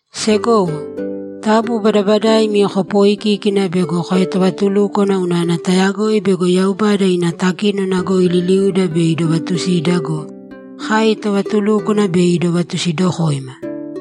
Segowo, taabu badabadaimi kopooikīkina bego koetovatulúkwana unana tayagoi bego Yaubada ina takínona goi liliuda bei idovatusida go, kai tovatulúkwana bei idovatusidokoima.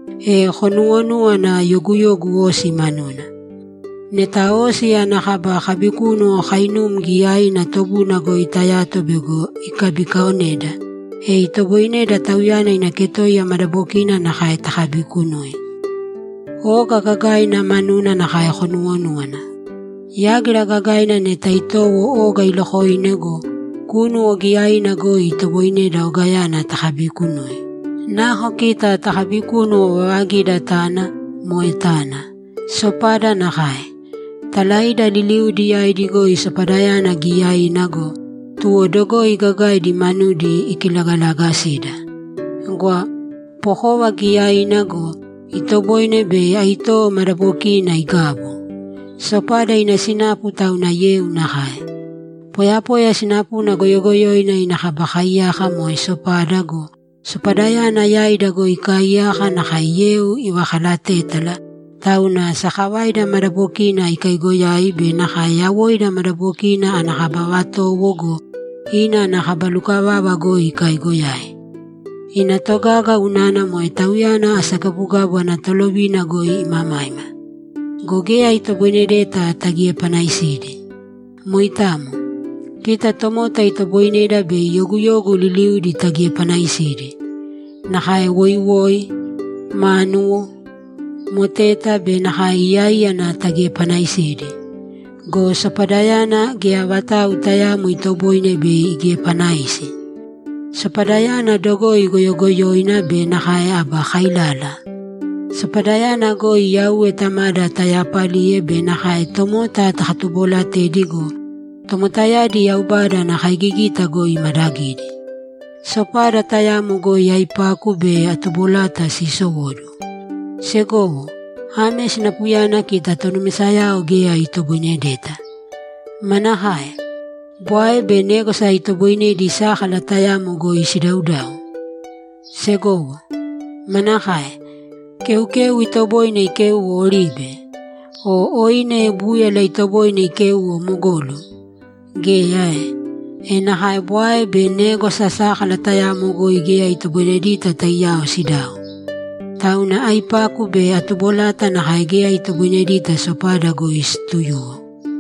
E konuwonúwana yoguyogu osi manuna. Neta osi ana kaba kabikúnuwo kainum giyaina tobuna goi tayato bego ikabikaaoneda, e itoboineda tauyana ina ketoiya madabokina nakae takabiikunui. Oga gagaina manuna nakae konuwonúwana. Yágira gagaina neta itowo oga ilokoine go, kúnuwo giyaina goi itoboineda ogayana takabiikunui. Nako kita tokabikúnuwo vavagida tana, moe tana. Sopada nakae. Talaida liliudi yaidi goi sopadayana giyaiina go, tuwo dogoi gagaidi manudi ikilagalagasida! Gwa! Pokova giyaiina go, itoboine bei aitowo madabokiina igabu! Sopada ina sinapu tauna yeu nakae. Poyapoya sinapuna goyogoyoina ina kaba kaiyaka moe sopada go, sopadayana yaida goi ikaaiyaka nakae yeu ivakalatétala, tauna sakavaida madabokina ikaiigoyai be nakae yawoida madabokina ana kaba vatowo go, ina ana kaba lukavava goi ikaiigoyai. Ina togaga unana moe tauyana asagabugabu ana tolovina goi imamaima. Go geya itoboinedeta tagiepanaisidi. Moitamo. Kita tomota itoboineda bei yoguyogu liliuudi tagiepanaisidi; nakae woiwoi, mánuwo, moteta be nakae iyaíyana tagiepanaisidi. Go sopadayana, geya vatau tayaamo itoboine bei igiepanaisi. Sopadayana dogoi goyogoyoina be nakae aba kailala. Sopadayana goi Yauwe Tamada tayaapaliye be nakae tomota takatuboolatedi go, tomotayadi Yaubada ana kaigigita goi imadagidi! Sopada tayamo goi aipaku be atubolata siisowóduwo. Segowo, ame sinapuyana kita tonumisayao geya itoboinedeta. Manakae? Bwae be négwasa itoboinedi sákala tayamo goi sidaudau? Segowo, manakae? Keukeu itoboine ikéuwo oribe? O oine búyala itoboine ikéuwo mogolu? Geya ae? E nakae bwae be négwasa sákala tayamo goi geya itoboinedita taiyao sidau. Tauna aipaku be atubolata nakae geya itoboinedita sopada goi siituyuwo.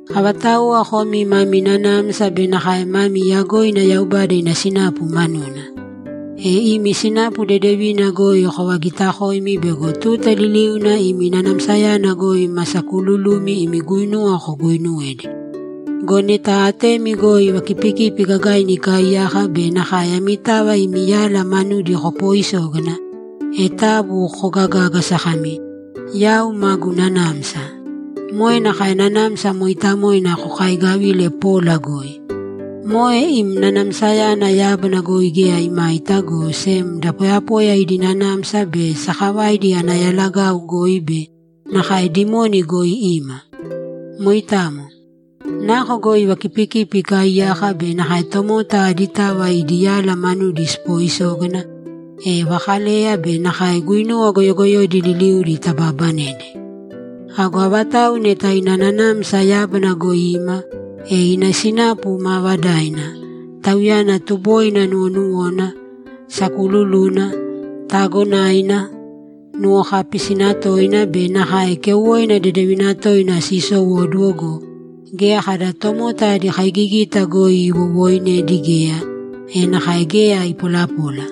Avatauwa komi mamii nanamsa be nakae mamii yagoina Yaubada ina sinapu manuna? E imi sinapu dedevina goi kovagiitakōimi bego tuta liliuna imi nanamsayana goi ma sakuululumi imi guinuwa koguuinuwedi. Go neta atemi goi vakipikipi gagaina ikaaiyaka be nakae amitava imi yala manudi kopooisógana, e taabu kogagāgasa kami, ‘Yau maguu nanamsa.’ Moe nakae Nanamsa Mooitamoina kokaigavile pola goi. Moe im nanamsayana yábana goi geya imaita, go sem da poyapoya idi nanamsa be sakavaidi ana yalagau goi be nakae dimoni goi ima. Moitamo. Nako goi vakipikipi ikaaiyaka be nakae tomota aditava idi yala manudi sipooisógana, e vakaleya be nakae guinuwa goyogoyoidi liliudi tabaabanedi. Ago avatau neta ina nanamsa yábana goi ima, e ina sinapu maavadaina, tauyana tuboina nuwonuwona, sakuululuna, taagonaina, nuwokaapisina toina be nakae keuwoina dedevina toina siisowóduwo go, geya kada tomota adi kaigigita goi iwowooinedi geya, e nakae geya ipolapola.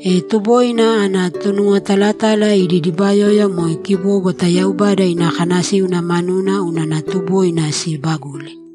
E tuboina ana tonuwotalatala idi dibayoya moe kibóbwata Yaubada ina kanasíuna manuna unana tuboina siibaguli.